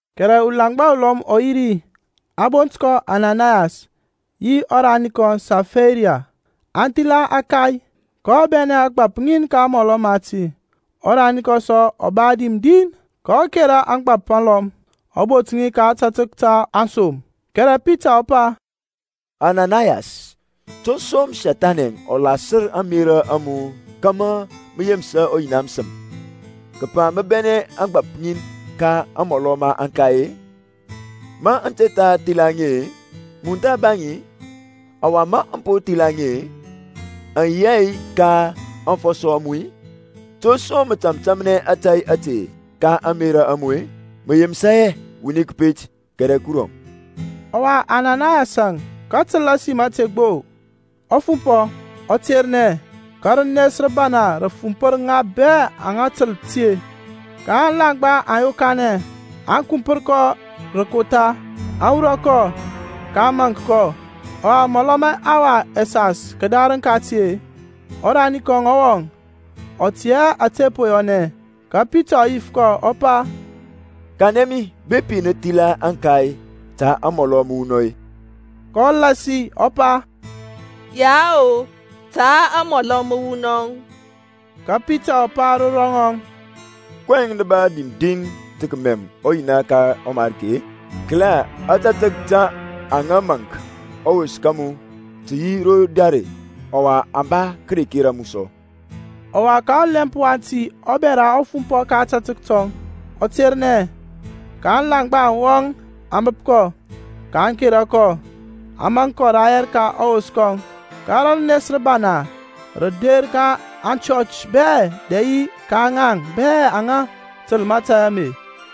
Kɛrɛ ulaŋgba ulɔm ɔ yi ri, a bont kɔ Ananayas, yi ɔrani kɔŋ Safaira, aŋ thila ȧkay, kɔ bɛnɛ ȧgbȧp ŋin ka amɔlɔ mati, ɔrani kɔŋ sɔ ɔ ba dim din, kɔ kȧrȧ ȧgbȧp alɔm, ɔ bot ŋi ka ȧtȧtək ta aŋsom. Kɛrɛ Pitaŋ ɔ pa, Ananayas, to som Sethani ɔ lasər ȧŋmerȧ a mu kȧmȧ mə yemsa ɔYina məsəm, kəpa mə bɛnɛ ȧgbȧp ŋin ka amɔlɔ ma aŋkai-e? Ma mə te tha thila ŋi-e, mun tha ba ŋi, ɔwa ma mə po thila ŋi-e, aŋ yi hɛ ka aŋfɔsɔ a mu-i? To som mə tȧmtȧmnɛ ȧtȧy ȧte ka ȧŋmerȧ a mu-e? Mə yemsa hɛ wuni kəpet kɛrɛ Kurɔŋ. Ɔwa Ananayas-əŋ, kətəl ȧsim ȧte gbo-e, ɔ fumpɔ, ɔ ternɛ, ka rənes rəbana rə fumpər ŋa bɛ aŋa təl ti. Ka aŋlaŋgba aŋ yokanɛ, aŋ kumpər kɔ rə kotha, aŋ wurɔ kɔ, kaŋ maŋk kɔ. Ɔwa mɔlɔ ma ɛhawa ɛsas kədarəŋ kati-e, ɔrani kɔŋ ɔ wɔŋ, ɔ tɛ hɛ ȧtȧ po yɔnɛ. Ka Pitaŋ ɔ yif kɔ ɔ pa, Kanɛ mi bepi nə thila ȧŋkay ta amɔlɔ məwunɔŋ-i? kɔ lasi ɔ pa, Yao, ta amɔlɔ məwunɔŋ. Ka Pitaŋ ɔ pa ro ŋɔŋ, kɔyɛŋ nə ba dim din tə kəmɛm ɔYina ka ɔMariki-e? Kəla, ȧtȧtək taŋ aŋa maŋk ɔwos ka mu tə yi ro dare, ɔwa aŋ ba kəkera mu sɔ. Ɔwa ka ɔlɛmp wati ɔbɛra ɔ fumpɔ ka ȧtȧtək tɔŋ, ɔ ternɛ. Ka aŋlaŋgba aŋ wɔŋ aŋ bəp kɔ, ka aŋ kera kɔ, aŋ maŋk kɔ rayɛr ka ɔwos kɔŋ. Ka rənes rəbana rə der ka aŋchɔch bɛ dɛ yi ka ŋaŋ bɛ aŋa təl mȧtȧy ame.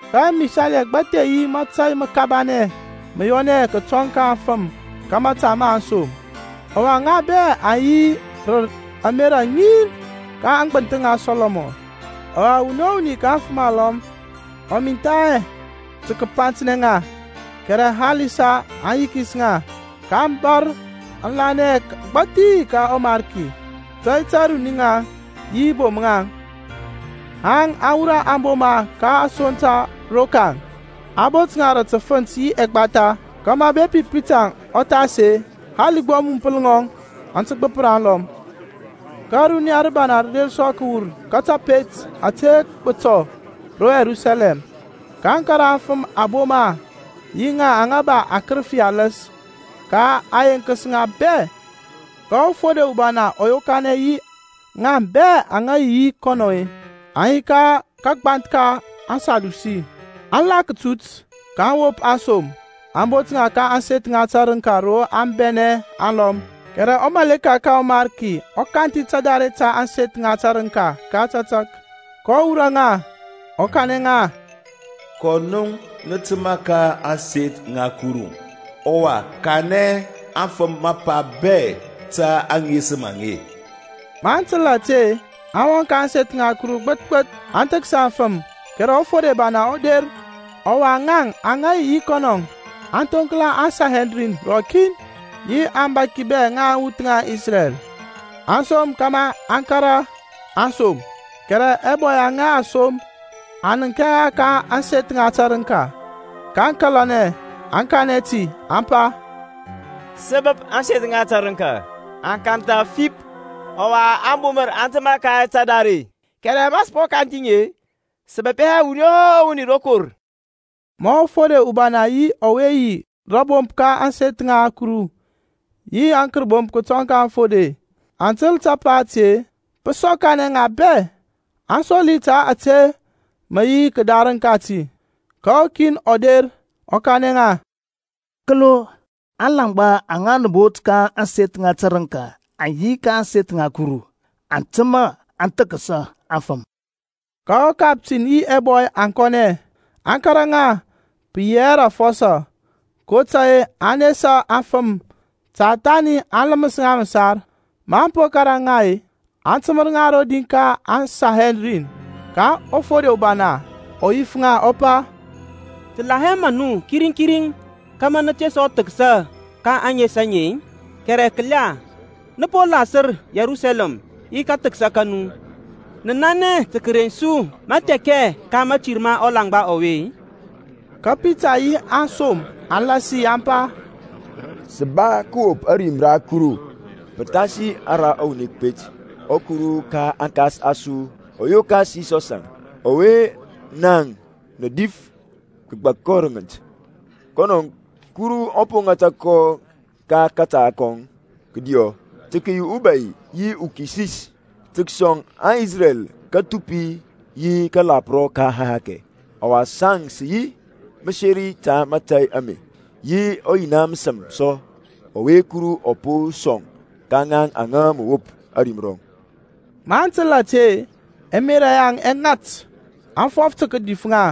Ka ɛmisali ɛgbathi yi mȧtȧy məkabanɛ mə yɔnɛ kətɔŋ ka aŋfəm ka mȧta ma aŋsom; ɔwa ŋa bɛ aŋ yi rə ȧmerȧ ŋin ka aŋgbənthəŋ ŋa Sɔlɔmɔn. Ɔwa wuni o wuni ka aŋfəm alɔm ɔ mintha hɛ tə kəpantnɛ ŋa, kɛrɛ halisa aŋ yikis ŋa. Ka a bȧr aŋlanɛ agbȧthi ka ɔMarki, tey ta runi-ŋaŋ yi bom-ŋaŋ, haŋ a wurɔ aŋboma ka asoŋ ta rokaŋ, a bot ŋa rə təfənt yi ɛgbatha, kȧmȧ bepi Pitaŋ ɔ thas-e, hali gbo amumpəl ŋɔŋ aŋ tə gbəpər alɔm. Ka runiya rəbana rə der sɔ kəwur ka tapet ȧte gbətɔ ro Yerusalɛm, kaŋ kȧrȧ afəm aŋboma, yi ŋaŋ aŋa ba akərəfi aləs, ka a yenkəs ŋa bɛ. Ka ɔfode ubana ɔ yokanɛ yi ŋaŋ bɛ aŋa yi yi kɔnɔŋ-e, (aŋa yi ka kagbanth ka aŋSadusi), aŋ la kətut, kaŋ wop aŋsom, aŋ bot ŋa ka ȧŋseth ŋa tərəŋka ro a bɛnɛ aŋlɔm. Kɛrɛ wurɔ ka ɔMarki ɔ kanthi tadare ta ȧŋseth ŋa tərəŋka ka tȧtȧk, kɔ wurɔ ŋa, ɔ kanɛ ŋa, Kɔ nu nə təmȧ ka ȧŋseth ŋa Kuru, ɔwa kanɛ anfəm mapa bɛ ta aŋesəm aŋe. Maŋ təl ȧte-e, aŋ wɔŋ ka ȧŋseth ŋa Kuru bəth bəth, aŋ thəksa aŋfəm, kɛrɛ ɔfode ubana ɔ der, ɔwa ŋaŋ aŋa yi yi kɔnɔ aŋ thoŋkla aŋSanhedrin rɔkin, yi aŋbȧki bɛ ŋa aŋwuth ŋa Isrɛl, a som kȧmȧ aŋ kȧrȧ aŋsom. Kɛrɛ ɛbɔy aŋa a som aŋ nənk hɛ ŋa ka ȧŋseth ŋa tərəŋka; kaŋ kȧlanɛ, aŋ kanɛ ti, aŋ pa, Sə bəp ȧŋseth ŋa tərəŋka aŋ kantha fip, ɔwa ȧŋbumər aŋ təmȧ ka tadare, kɛrɛ ma sə po kanthi ŋi, sə bəp hɛ wuni o wuni rokor. Ma ɔfode ubana yi ɔwe yi rȧbomp ka ȧŋseth ŋa Kuru yi aŋkərbomp kətɔŋ ka aŋfode aŋ təl tapa ȧte-e, pə sɔkanɛ ŋa bɛ, aŋ soli ta ȧtȧ mə yi kədarəŋ kati. Ka ukin ɔ der ɔ kanɛ ŋa, Kəlo, aŋlaŋgba aŋa nə bot ka ȧŋseth ŋa tərəŋka aŋ yi ka ȧŋseth ŋa Kuru, aŋ təmȧ aŋ thəksa aŋfəm. Ka ɔkaptin yi ɛbɔy aŋ kɔnɛ, aŋ kȧrȧ ŋa, pə yi hɛ rə afɔsɔ, kotȧy-e aŋ nesa aŋfəm ta thani aŋ ləməs ŋa məsar. Maŋ po kȧrȧ ŋa, a təmər ŋa rodi ka aŋSanhedrin. Ka ɔfode ubana ɔ yif ŋa ɔ pa, Sə la hɛ maŋ nu kiriŋ kiriŋ kȧmȧ nə te sɔ thəksa ka ȧŋes aŋe-i? Kɛrɛ kəla, nə po lasər Yerusalɛm yi kathəksa ka nu. Nə nanɛ tə kəreŋ su mathɛkɛ ka mȧtir ma ɔlaŋgba ɔwe-e? Ka Pitaŋ yi aŋsom aŋ lasi aŋ pa, Sə ba kəwop ȧrim ra Kuru pəthasi ara wuni kəpet. ƆKuru ka aŋkas a su ɔ yokas Yisɔsȧŋ, ɔwe naŋ nə dif, kəgbak kɔ rə ŋənt. Kɔnɔ Kuru ɔ po ŋata ka kȧta kɔŋ kədiɔ tə kəyi uBȧy yi uKisis tə kəsɔŋ Isrɛl kathupi yi kȧlȧprɔ ka ɛhakɛ. Ɔwa saŋ sə yi mȧseri ta mȧtȧy ame; yi ɔYina məsəm sɔ ɔwe Kuru ɔ po sɔŋ ka ŋaŋ aŋa mə wop ȧrim rɔŋ. Maŋ təl ȧte-e, ɛmerȧ yaŋ ɛ ŋat, aŋ fɔf tə kədif ŋa.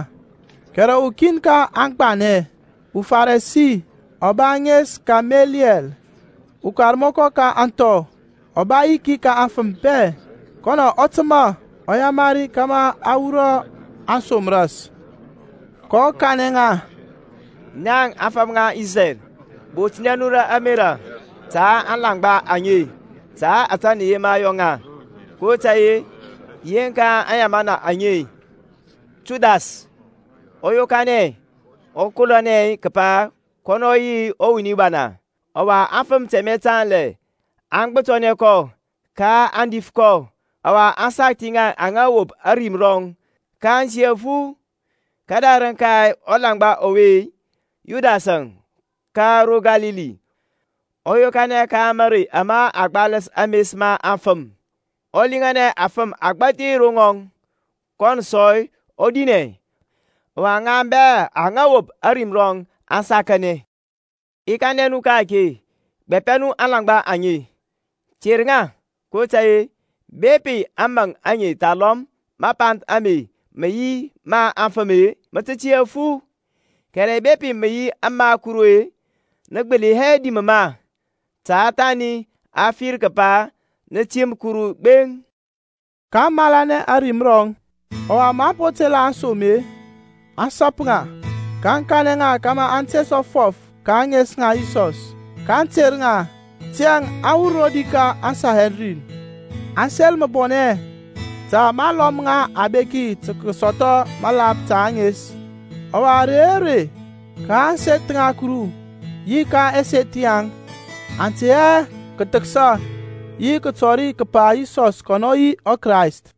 Kɛrɛ ukin ka aŋgbanɛ, uFarisi, ɔ ba ȧŋes Kameliyɛl, ukarmɔkɔ ka ȧŋthɔ, ɔ ba yiki ka aŋfəm bɛ, kɔnɔ ɔ təmȧ, ɔ yamari kȧmȧ aŋ wurɔ aŋsom ras. kɔ kanɛ ŋa, Naŋ afəm ŋa Isrɛl, botnɛ nu rə ȧmerȧ ta aŋlaŋgba aŋe, ta ȧtȧ nə yema yɔ ŋa, kotȧy-e yeŋka aŋyamana aŋe-e, Thudas ɔ yokanɛ, ɔ kolonɛ kəpa kɔnɔ ɔ yi wuni bana; ɔwa afəm tɛmɛ tanlɛ aŋ gbɛpətənɛ kɔ; ka a dif kɔ, ɔwa a sakthi ŋa aŋa wop ȧrim rɔŋ, kaŋ tiyȧ fu. Kədarəŋ ka ɔlaŋgba ɔwe-e, Yudas ka ro Kalili ɔ yokanɛ ka marey ama a gbaləs ames ma aŋfəm, ɔ liŋanɛ afəm agbȧthi ro rɔŋɔŋ; kɔnɔ sɔ ɔ dinɛ, ɔwa ŋaŋ bɛ aŋa wop ȧrim rɔŋ aŋ sakanɛ. I kanɛ nu ka-ake, gbapɛ nu aŋlaŋgba aŋe. Ter ŋa kotȧy-e bepi ȧŋmȧŋ aŋe thalɔm mapanth ame mə yi ma afəm-e, mə tə tiyȧ fu; kɛrɛ bepi mə yi ma Kuru-e, nə gbəli hɛ dim ma, ta thani a fir kəpa nə tim Kuru gbeŋ. kaŋ malanɛ ȧrim rɔŋ. Ɔwa maŋ po tela aŋsom-e, aŋ sap ŋa, kaŋ kanɛ ŋa kȧmȧ aŋ te sɔ fɔf ka ȧŋes ŋa Yisɔs, kaŋ ter ŋa. Tiyȧŋ aŋ wur rodi ka aŋSanhedrin, aŋ sel məbɔnɛ ta ma a lɔm ŋa abeki tə kəsɔthɔ məlap ta ȧŋes. Ɔwa ȧrey o rey ka ȧŋseth ŋa Kuru yi ka ɛseth yaŋ aŋ tey hɛ kəthəksa yi kətɔri kəpa Yisɔs kɔnɔ yi ɔKrayst.